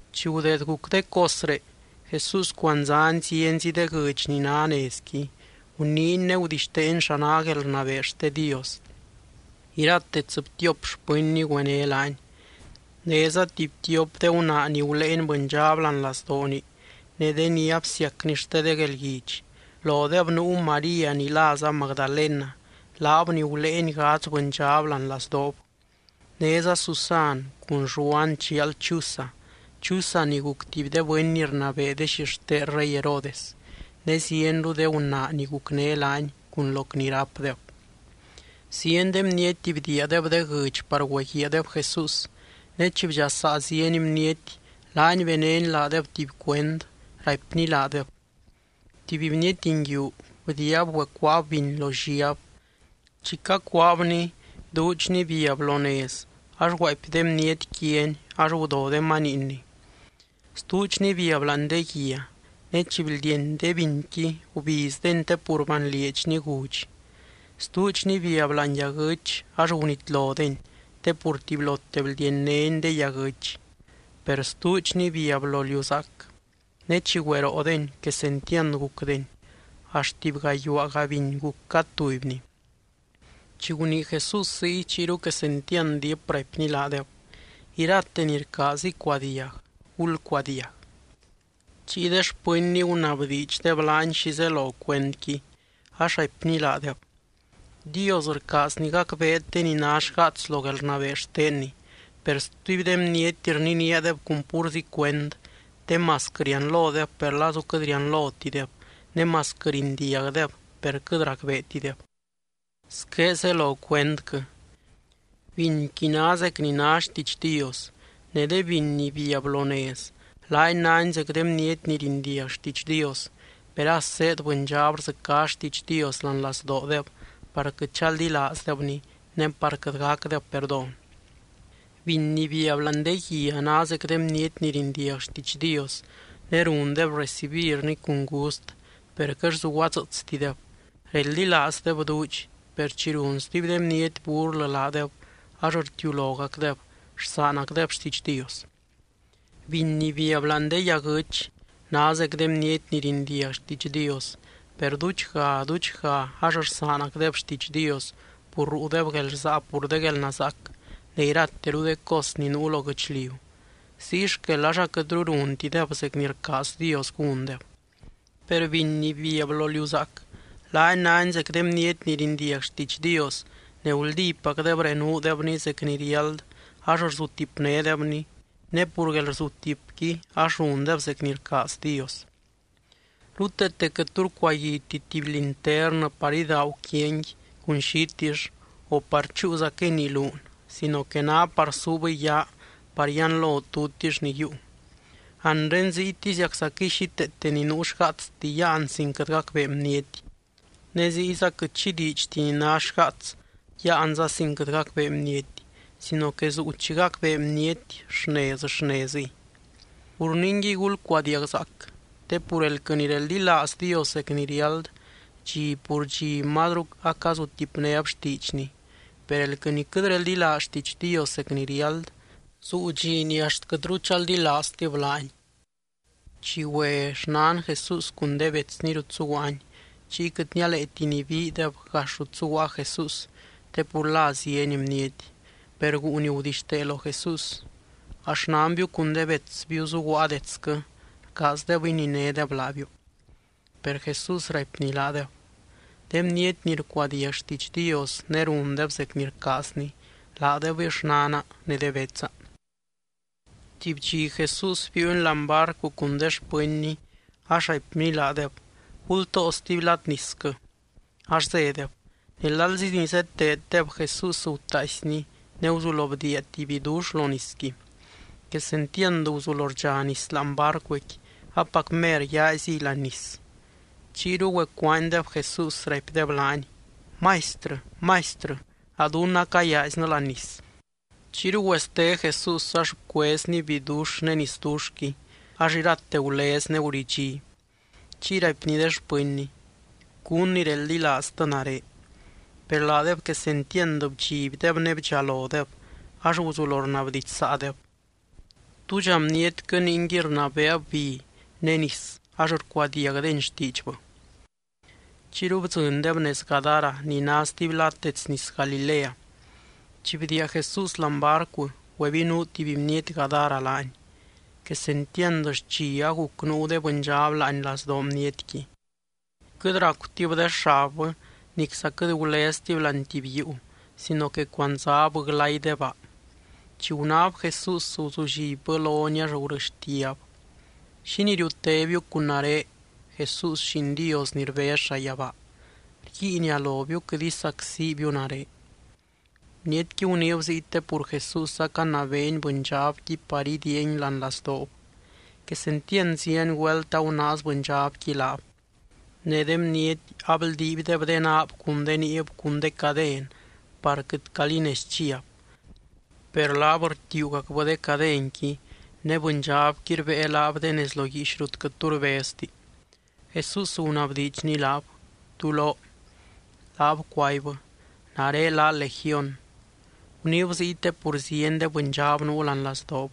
Chi gudeed guc de cosré, Jesús cuandzány zienzi de guɨdx ni ná nezdequi. Guniiny ne gudixteeny xa ná guelrnabee xte Dios. Irate tsɨbtiop xpɨnny güené laany. Néza tuby tiop de gunaa ni guléeny bɨndxab láani lazdooni ne de ni absiacny xte de guelguidx. Lodeb nuu María ni láza Magdalena, laab ni guléeny gadz bɨndxab láani lazdoob. Néza Susan cun Lluan chial Chuza, Chuza ni guc tuby de bɨny ni rnabee de xixten rey Herodes, ne zienru de gunaa ni gucné laany cun loc ni rápdeb. Zieny de bniety bdiiadeb de guɨdx par güeguiaadeb Jesús. Ne chi bdxasaa zieny bniety, laany benény laadeb tuby cuend, raipny laadeb: —Tuby bniety nguiu bdiiab güecuaab biny lo lliab. Chi cacuaabni, duudxni biab lo nez ax guaapy de bniety quiani ax gudo de maniinni. Stuudxni biab láani de guia. Ne chi bldieny de binqui gubizdeni te pur banlieedxni gudx. Stuudxni biab láani yaguɨ́ch ax gunitlodeni te pur tubylote bldiennédeni de yaguɨ́ch. Per stuudxni biab lo liu zaac. Ne chi güeroodeni, quesentiand gucdeny, axt tuby gayuaaga biny guc cad tubyni. Chi gunii Jesús ziy, chiyru quesentiand diip raipny laadeb: —Irate ni rcaaz icuadiag, gulcuadiag. Chiy de xpɨnny gunabdiidxdeb laany xi zelo cuendqui, ax raipny laadeb: —Dios rcaazny gacbeet de ni ná xgaats lo guelrnabee xtenny. Per stuby de bniety rniníadeb cun púrzi cuend te masquɨ rianlodeb, per lazu quɨt rianlotideb ne masquɨ rindiagdeb per quɨt racbeetideb. ’Squé zelo cuendquɨ: Binqui ná zec ni ná xtiidx Dios. Ne de biny ni biab lo nez, laani náni zec de bniety ni rindiag xtiidx Dios, per as zéed bɨndxab rdzɨcá xtiidx Dios láani lazdoodeb par quɨt chaldilaazdebni ne par quɨt gacdeb perdón. Biny ni biab láani de guia ná zec de bniety ni rindiag xtiidx Dios ne rundeb recibirni cun gust, per quɨt zuguadzɨɨtstideb. Reldilaazdeb duudx, per chi run stuby de bniety burlɨ laadeb ax rtiulogacdeb, rsaanacdeb xtiidx Dios. Biny ni biab láani de yaguɨ́ch ná zec de bniety ni rindiag xtiidx Dios, per duudxga, duudxga ax rsaanacdeb xtiidx Dios pur ruudeb guelrsaa pur de guelnazaac ne irateru de cos ni nuu lo guɨchliu, ziy xquel ax aquɨtru runtideb zec ni rcaaz Dios gúndeb. Per biny ni biab lo liu zaac, laani náni zec de bniety ni rindiag xtiidx Dios ne guldípacdeb renuudebny zec ni riáld ax rzutipnédebny, ne pur guelrzutipqui ax rundeb zec ni rcaaz Dios. ’Ruteete quɨt tu rcuaguiti tuby linternɨ par idaagu quiani cun xitill o par chúuzaquɨy nii luun sino que ná par suubɨy yaa par yianlo tutix ni yiiu. Anre ziytiziaczaquɨy xíteete ni nuu xgaatsti yáan sin quɨt gacbee bniety. Ne ziyza quɨt xi diidxti ni ná xgaats yáanza sin quɨt gacbee bniety sino que zuu chi gacbee bniety xnez, xnezɨy. ’Pur ningui, gulcuadiagzaac. Te pur elquɨ ni reldilaaz Dios zec ni riáld, dxi pur dxi mazru acazutipnéb xtiidxny. Per elquɨ ni quɨt reldilaaz xtiidx Dios zec ni riáld, zuu dxi ni axt quɨtru chaldilaaztib laany. Chi güe xnan Jesús cun de betsny rut zuguaany, chiy quɨt nialeeti nibiideb gax rut zuguaa Jesús te pur la zieny bniety. Per guu ni gudixtee lo Jesús: —A xnanbiu cun de betsbiu zuguaa detsquɨ. Rcaazdeb ininédeb laabiu. Per Jesús raipny laadeb: —De bniety ni rcuadiag xtiidx Dios ne rundeb zec ni rcaazny, laadebɨy xnana ne de betsa. Tuby dxi Jesús biiuny láani barcu cun de xpɨnny ax raipny laadeb: —Gultoo stuby lad nisquɨ. Ax zédeb. Ne lalzi ni zeteeddeb, Jesús gutaaisny ne guzulo bdiia tuby bidux lo nisqui. Quesentiand guzulo rdxa nis láani barcuqui. Apac mer yaaziy láani nis. Chiyru güecuaanydeb Jesús, raipdeb laany: —¡Maistrɨ! ¡Maistrɨ! ¡A dunnɨ acayaaiznɨ láani nis! Chiyru güeste Jesús ax bcuezny bidux ne nisduxqui ax irate gulez ne guridxí. Chiy raipny de xpɨnny: —¿Cún ni reldilaaztɨ nare? Per laadeb quesentiand bdxibdeb, ne bdxalodeb ax guzulo rnabdidxsaadeb: —¿Túdxa bnietquɨ ningui rnabeeb bi ne nis ax rcuadiagdeni xtiidxbɨ? Chiyru bdzɨndeb nez Gadara ni ná stuby lad dets nis Galilea. Chi bdiia Jesús láani barcu, güebinuu tuby bniety Gadara laany. Quesentiand xchi aguc nuu de bɨndxab láani lazdoo bnietqui. Quɨt racutib de xabbɨ nicza quɨt guleztib láani tuby yuu sino que cuandzab glay de baa. Chi gunáb Jesús, guzullibbɨ lony, ax gurɨxtiab: —¿Xínii riutébiu cun nare, Jesús, Lliin Dios ni rbez llayabaa? Rguiinia lobiu: Quɨt isacsibiu nare. (Bnietqui guniib ziy te pur Jesús acanabeeny bɨndxabqui par idiiangui láani lazdoob. Quesentiand zieny güelt agunaaz bɨndxabqui laab. Ne de bniety abldiibdeb de naab cun de niib cun de caden par quɨt calí nez chiab. Per laab rtiuugacbɨ de cadenqui ne bɨndxabqui rbée laab de nez lo guiix rut quɨt tu rbezti.) Jesús gunabdiidxny laab: —¿Tú lóo? Laab cuaibbɨ: —Nare lá Legión. Guniib ziy te pur zieny de bɨndxab nuu láani lazdoob.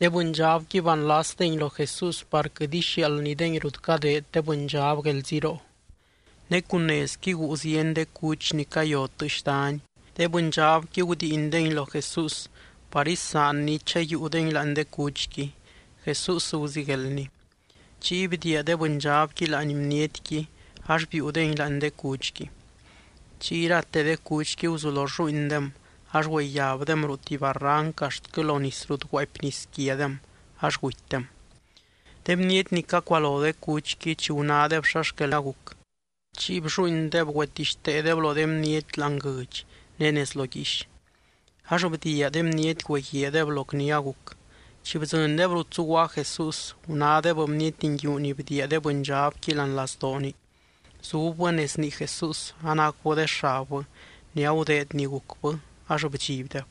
De bɨndxabqui banlasdengui lo Jesús par quɨt ixiaaldnydengui rut cadeed de bɨndxab guelziroo. Ne cun nezqui guu zieny de cuch ni cayo tɨɨx dany, de bɨndxabqui gudiindengui lo Jesús par isaanny chayiiudengui láani de cuchqui. Jesús guzigueldny. Chiy bdiia de bɨndxabqui láani bnietqui ax biiudengui láani de cuchqui. Chiy irate de cuchqui guzulo rlluuindem ax güeyabdem ruu tuby barranc axtquɨ lo nis rut guaapy nis quiadem ax gutydem. De bniety ni cacualo de cuchqui, chi gunádeb xa xquel aguc, chiy blluuindeb güetixteedeb lo de bniety láani guɨdx ne nez lo guiix. Ax bdiia de bniety güeguiaadeb loc ni aguc. Chi bdzɨndeb rut zuguaa Jesús, gunádeb bniety nguiu ni bdiia de bɨndxabqui láani lazdooni, zubbɨ nez nii Jesús anacubɨ de xabbɨ ne agudeed ni gucbɨ ax bdxibdeb.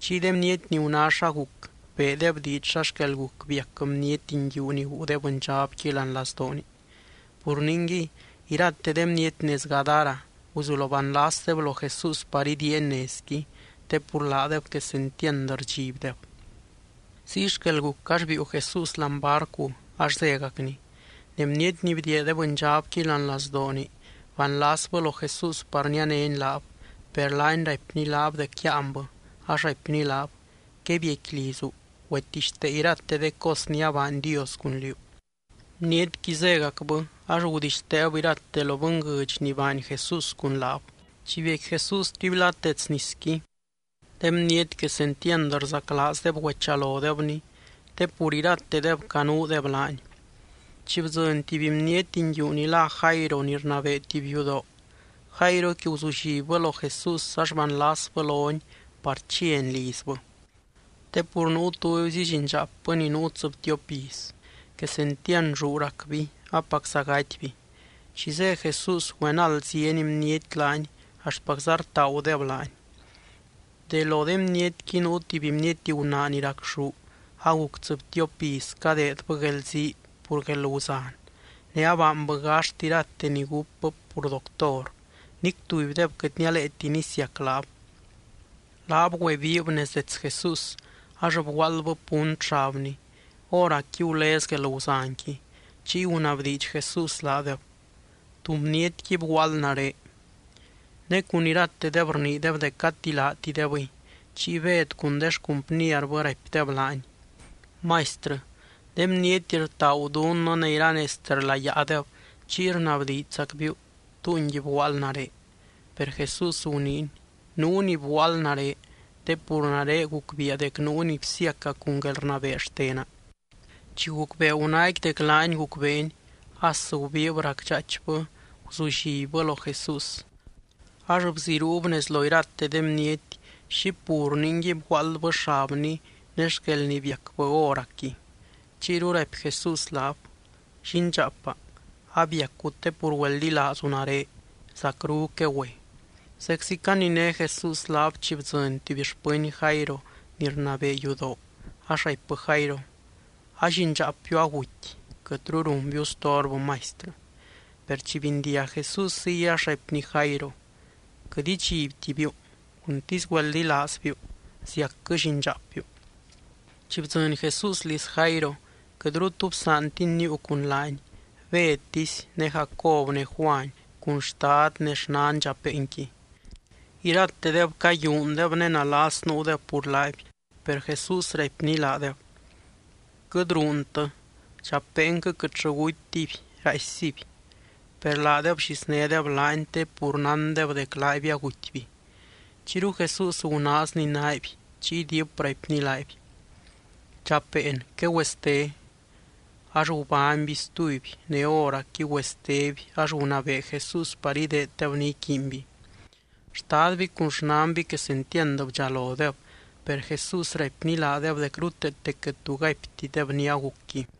Chiy de bniety ni guná xa guc, beedeb diidx xa xquel guc biac bniety nguiu ni guu de bɨndxabqui láani lazdooni. Pur ningui, irate de bniety nez Gadara guzulo banlasdeb lo Jesús par idiiany nezqui, te pur laadeb quesentiand rdxibdeb. Ziy xquel guc ax biiu Jesús láani barcu ax zégacny. Ne bniety ni bdiia de bɨndxabqui láani lazdooni banlasbɨ lo Jesús par nianény laab. Per laany raipny laab dec yáanbɨ, ax raipny laab: —Quebiecqui lizu. Güetixtee irate de cos ni abaany Dios cun liú. Bnietqui zégacbɨ ax gudixteeb irate lo bɨnguɨdx ni baany Jesús cun laab. Chi biecqui Jesús stuby lad dets nisqui, de bniety quesentiand rzaclaazdeb güechalodebny te pur iratedeb canuudeb laany. Chiy bdzɨny tuby bniety nguiu ni lá Jairo ni rnabee tuby yudoo. Jairoqui guzullibbɨ lo Jesús ax banlasbɨ lony par chiany lizbɨ. Te pur nuu tubyzi llindxaapbɨ ni nuu tsɨbtiop iz. Quesentiand lluu racby apacza gatyby. Chi zé Jesús, güenald zieny bniety laany axtpacza rtaagudeb laany. De lo de bnietqui nuu tuby bniety gunaa ni racxú aguc tsɨbtiop iz cadeedbɨ guelzii pur guelguzan ne abaanbɨ gaxt irate ni gúpbɨ pur doctor, nic tubydeb quɨt nialeeti nisiac laab. Laab güebiib nez dets Jesús ax bguaaldbɨ punt xabny, hóracqui gulez guelguzanqui. Chiy gunabdiidx Jesús laadeb: —¿Tú bnietqui bguaald nare? Ne cun iratedeb rniideb dec gati laatidebɨy. Chiy Bed cun de xcumpnierbɨ raipdeb laany: —Maistrɨ, de bniety rtaagu dunnɨ ne iranezte rlayaadeb, chiy rnabdiidxzacbiu: “¿Túngui bguaald nare?” Per Jesús guniiny: —Nuu ni bguaald nare te pur nare gucbiia dec nuu ni bsiaca cun guelrnabee xtena. Chi gucbee gunaaqui dec laany gucbeeny, as gubiib racdxaaichbɨ guzullibbɨ lo Jesús. Ax bziruub nez lo irate de bniety xi pur ningui bguaaldbɨ xabny ne xquel ni biacbɨ hóracqui. Chiyru raipy Jesús laab: —Llindxaapa, abiacu te pur güeldilaazu nare. Zacru quegüe. Zeczi caniné Jesús laab, chi bdzɨny tuby xpɨny Jairo ni rnabee yudoo ax raipbɨ Jairo: —A llindxaapbiu aguty. Quɨtru runbiu storbɨ Maistrɨ. Per chi bindiag Jesús ziy ax raipny Jairo: —Quɨt idxibtibiu. Cuntisy güeldilaazbiu, ziacquɨ llindxaapbiu. Chi bdzɨny Jesús liz Jairo, quɨtru tu bsaantiny níiu cun laany Bedtisy, ne Jacob ne Juany cun xtad ne xnan dxapeenqui. Iratedeb cayúundeb ne nalas nuudeb pur laaby. Per Jesús raipny laadeb: —Quɨt ruuntɨ. Dxapeenquɨ quɨtllɨ gutytiby, raaissiby. Per laadeb blliznédeb laany te pur nándeb dec laaby agutyby. Chiyru Jesús gunaazny naaby, chiy diip raipny laaby: —Dxapeen, quegüeste. Ax gubányby stuby, ne hóracqui güesteby ax gunabee Jesús par ideeddeb ni iquiinby. Xtadby cun xnanby quesentiand bdxalodeb. Per Jesús raipny laadeb dec ruteete quɨt tu gaiptideb ni agucqui.